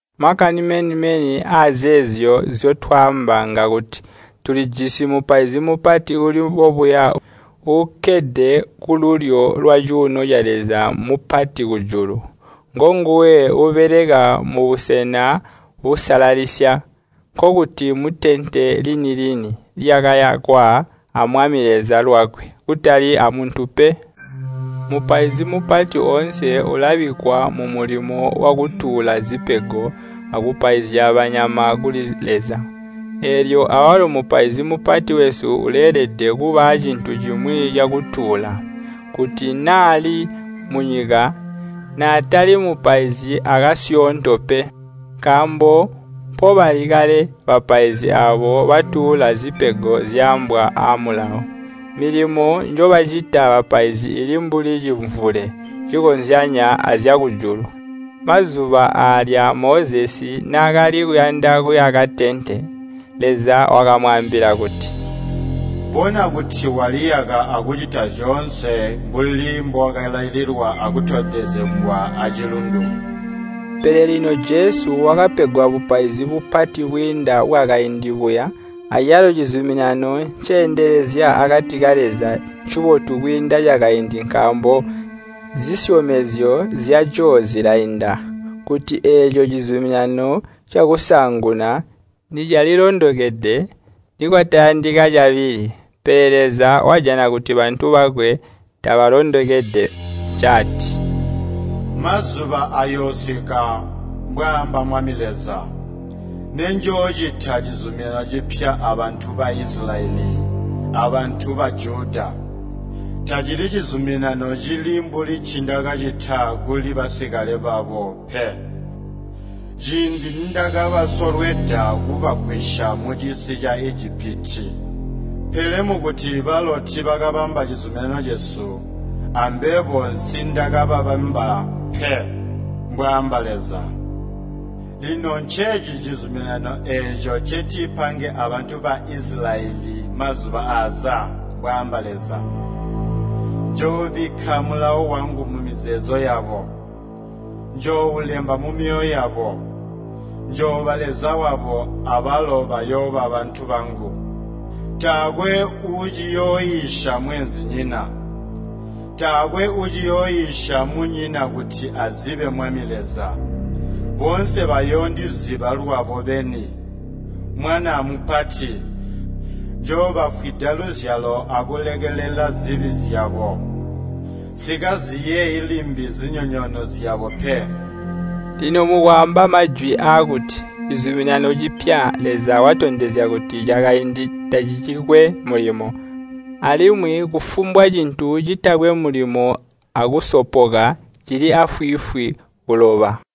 Makani meni-meni azeezyo nzyotwaamba ngakuti tulijisi Mupaizi Mupati uuli bobuya, uukkede kululyo lwacuuno ca Leza Mupati kujulu. Ngonguwe uubeleka mu Busena Busalalisya, nkokuti mutente lini-lini lyakayakwa a Mwami Leza lwakwe, kutali amuntu pe. Mupaizi Mupati oonse ulabikkwa mumulimo wakutuula zipego akupaizya banyama kuli Leza. Eelyo awalo Mupaizi Mupati wesu uleelede kuba aacintu cimwi cakutuula. Kuti naali munyika, naatali mupaizi akasyoonto pe, nkaambo mpobali kale bapaizi aabo batuula zipego zyaambwa aamulawo. Milimo njobacita bapaizi ili mbuli cimvule cikozyanya azyakujulu. Mazuba aalya Mozesi naakali kuyanda kuyaka tente, Leza wakamwaambila kuti, “Bona kuti waliyaka akucita zyoonse mbuli mbookalaililwa akutondezegwa acilundu.” Pele lino Jesu wakapegwa bupaizi bupati bwiinda bwakaindi buya, acalo cizuminano nceendelezya akati ka Leza ncibotu kwiinda cakaindi nkaambo zisyomezyo zyaco zilainda. Kuti eeco cizuminano cakusaanguna nicalilondokede, nikwatayandika cabili. Pele Leza wajana kuti bantu bakwe tabalondokede ncaati, “Mazuba ayoosika, mbwaamba Mwami Leza, nenjoocita cizuminano cipya abantu ba Isilayeli, abantu ba Juda. Tacili cizuminano cili mbuli ncindakacita kuli basikale babo pe, ciindi nindakabasolweda kubagwisya mucisi ca Ijipiti. Pele mukuti balo tiibakabamba cizuminano cesu, ambebo nsiindakababamba pe, mbwaamba Leza. Lino nceeci cizuminano eeco ncentipange abantu ba Isilayeli mazuba aaza, mbwaamba Leza. Njoobikka mulawo wangu mumizeezo yabo, njooulemba mumyoyo yabo. Njooba Leza wabo, abalo bayooba bantu bangu. Taakwe uuciyooiisya mweenzinyina. Taakwe uuciyooiisya munyina kuti azibe Mwami Leza. Boonse bayoondiziba lwabo beni, mwana amupati. Njoobafwida luzyalo akulekelela zibi zyabo. Nsikaziyeeyi limbi zinyonyoono zyabo pe.” Lino mukwaamba majwi aakuti, “Cizuminano cipya,” Leza watondezya kuti cakaindi tacicikwe mulimo. Alimwi kufumbwa cintu citakwe mulimo akusopoka, cili aafwiifwi kuloba.